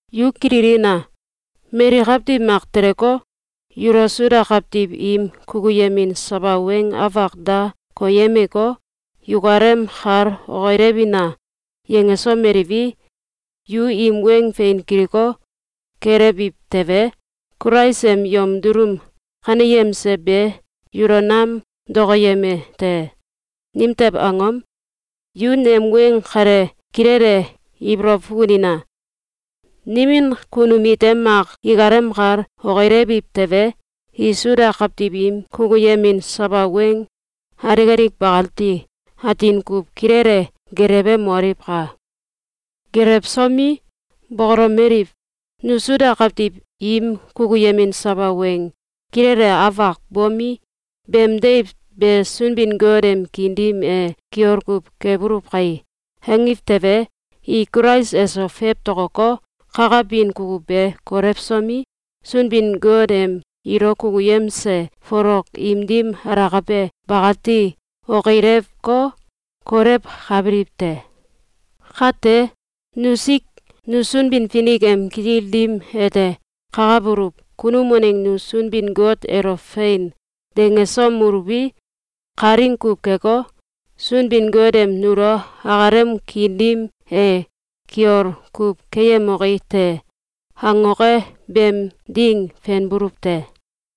Yu kililina! Mali kawtiw mak teleko, yulo Suda kawtiw im kukuyemin sawa weng afak da koyemeko, “Yukalem kal okilewina!”, yangesomeliwi, yu im weng fein kiliko, gelewiw tewe, Kulais em yom dulum kaneyemse be yulo nam dokoyeme te. Nimtew angom? Yu nem weng kale kilele ibolow fukunina! Nimin kunum ite mak ikalem kal okilewiw tewe, i Suda kawtiw im kukuyemin sawa weng alik alik bakati atin kuw kilele gelewemoliwka! Gelewsomi, bokolomeliw: “Nu Suda kawtiw im kukuyemin sawa weng kilele afak bomi, beem deiw be Sunbin-Got em kiin dim e kiol kuw kebuluw kai!”, angiw tewe, i Kulais eso fewtokoko, kakabin kukuw be kolewsomi, Sunbin-Got em ilo kukuyemse folok im dim alakabe bakati okilewko, kolewkabiliw te. Kate, nusik, nu Sunbin-Finik em kitil dim ete kakabuluw kunum waneng nu Sunbin-Got elo “Fein!”, dangesomeluwi, kalaing kuw keko, Sunbin-Got em nulo akalem kiin dim e “Kiol kuw keyemoki te!”, angoke beem ding fenbuluw te.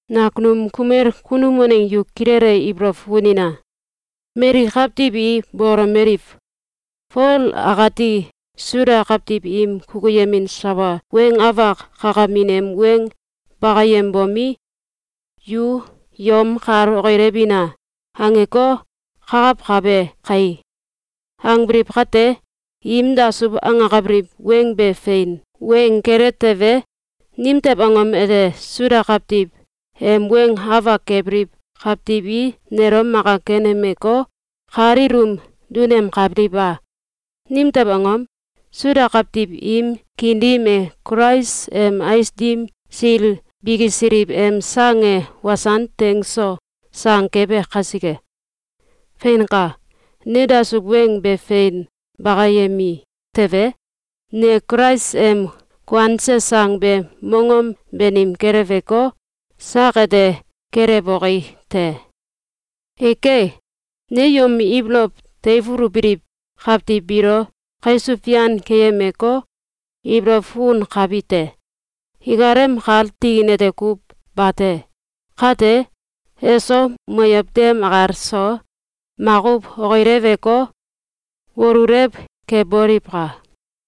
Nakunum kumel kunum waneng yu kilele ibolow fukunina! Mali kawtiw i bokolomeliw: “Fol akati Suda kawtiw im kukuyemin sawa weng afak kakamin em weng bakayembomi, ‘Yu yomékal okilewina!’, angeko, kakawkabe kai!”, angbiliw kate, im dasuw angakabiliw weng be fein weng kele tewe, nimtew angom ete Suda kawtiw em weng afak kebiliw kawtiw i nelo maka kenemeko, kal ilum dunemkabiliw a? Nimtew angom? Suda kawtiw im kiin dim e Kulais em ais dim sil bikisiliw em sang e wasan teng so sang kebe kasike. Feinka! Ne dasuw weng be fein bakayemi tewe, ne Kulais em kuanse sang be mongom banim keleweko, sak ete kelewoki te. Eke! Ne yom ibolow teifulubiliw kawtiw biilo kaisuw fian keyemeko, ibolow fukunkabite: Ikalem kal tikin ete kuw bate. Kate, eso, moyow dem akal so, makuw okileweko, wolulew keboliwka!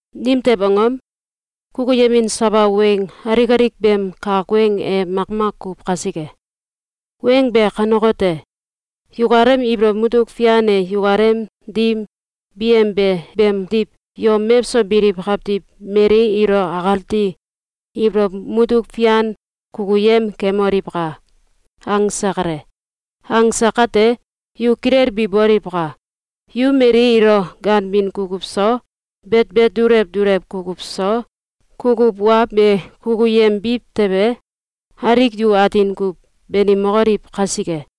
Nimtew angom? Kukuyemin sawa weng alik alik beem kak weng e makmak kuw kasike. Weng be kanekote: “Yukalem ibolow mutuk fian e yukalem dim biyembe beemdiw yom mewso biliw kawtiw mali ilo akati ibolow mutuk fian kukuyem kemoliwka!”, angse kale. Angse kate, yu kilelbi boliwka! Yu mali ilo ganbin kukuw so, betbet dulew dulew kukuw so, kukuw wa be kukuyembiw tewe, alik yu atin kuw banimokoliw kasike.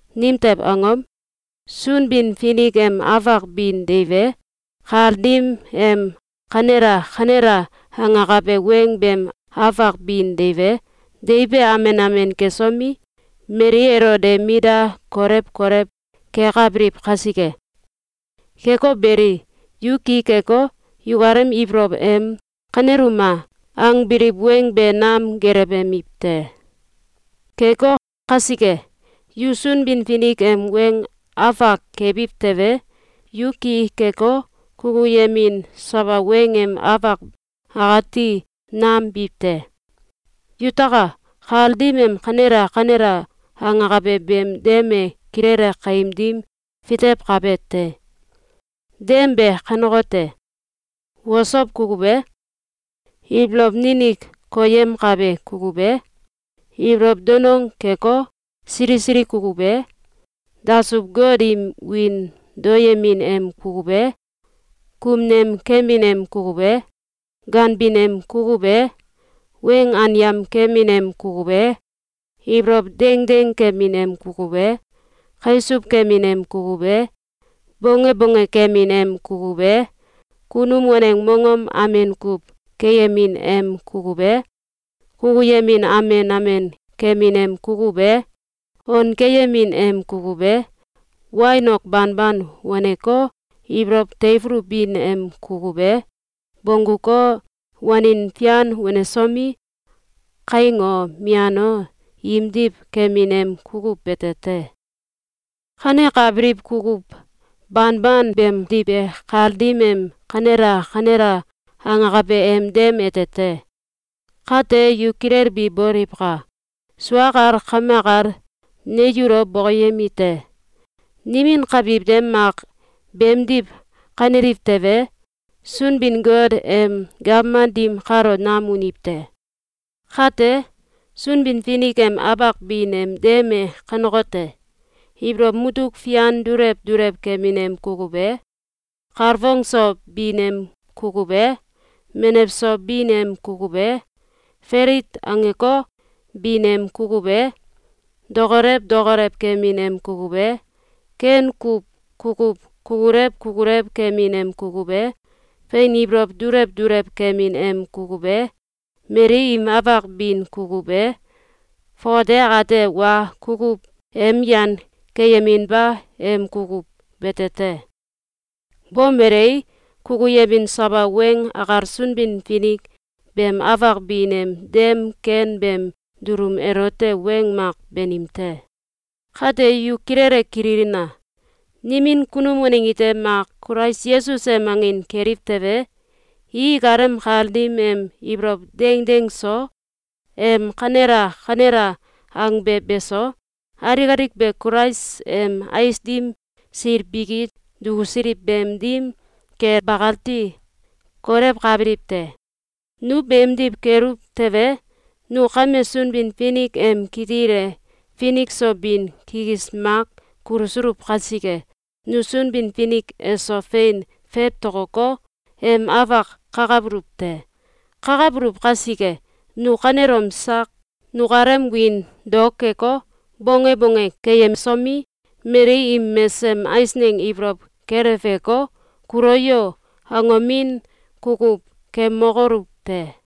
Nimtew angom? Sunbin-Finik em afak bin deiw e, kal dim em “Kanela! Kanela!”, angakabe weng beem afak bin deiw e, deiw be amen amen kesomi, mali elo de mit da kolew kolew kekabiliw kasike. Keko beli, yu ki keko, yukalem ibolow em “Kaneluma!”, angbiliw weng be nam gelewemiw te. Keko kasike, yu Sunbin-Finik em weng afak kebiw tewe, yu ki keko, kukuyemin sawa weng em afak akati nam biw te. Yutaka! Kal dim em “Kanela! Kanela!”, angakabe beem dem e kilele kaim dim fitewkabe te. Dem be kanekote: Osow kukuw e, ibolow ninik koyemkabe kukuw e, ibolow danong keko, sili sili kukuw e, dasuw-got im wiin daoyemin em kukuw e, kumnem kemin em kukuw e, ganbin em kukuw e, weng anyam kemin em kukuw e, ibolow dengdeng kemin em kukuw e, kaisuw kemin em kukuw e, bonge bonge kemin em kukuw e, kunum waneng mongom amen kuw keyemin em kukuw e, kukuyemin amen amen kemin em kukuw e, on keyemin em kukuw e, wain ok banban waneko, ibolow teifulubin em kukuw e, bongguko, wanin fian wanesomi, kaing o, mian o, imdiw kemin em kukuw bete te. Kanekabiliw kukuw banban beemdiw be kal dim em “Kanela! “Kanela!”, angakabe em dem ete te. Kate yu kilelbi boliwka! Sua akal kame akal ne yulo bokoyemite: Nimin kawtiw ite mak beemdiw kaneliw tewe, Sunbin-Got em gawman dim kalo nam uniw te. Kate, Sunbin-Finik em afak bin em dem e kanekote: Ibolow mutuk fian dulew dulew kemin em kukuw e, kalfong so bin em kukuw e, menew so bin em kukuw e, falit angeko, bin em kukuw e, dokolew dokolew kemin em kukuw e, ken kuw kukuw kukulew kukulew kemin em kukuw e, fein ibolow dulew dulew kemin em kukuw e, mali im afak bin kukuw e, fongate akate wa kukuw em yan keyeminba em kukuw bete te. Bomelei, kukuyemin sawa weng akal Sunbin-Finik beem afak bin em dem ken beem dulum elote weng mak banim te. Kate yu kilele kililna! Nimin kunum waneng ite mak Kulais Yesus em angin keliw tewe, i ikalem kal dim em ibolow dengdeng so, em “Kanela! Kanela!”, angbe beso, alik alik be Kulais em ais dim sil biki dukusiliw beem dim kel bakati kolewkabiliw te. Nu beemdiw keluw tewe, nu kame Sunbin-Finik em kitil e finik so bin kikis mak kulusuluw kasike, nu Sunbin-Finik eso fein fewtokoko, em afak kakabuluw te. Kakabuluw kasike, nu kanelom sak nukalem wiin dao keko, bonge bonge keyemsomi, mali im mesesem eisneng ibolow keleweko, “Kulo yo!”, angomin kukuw kemokoluw te!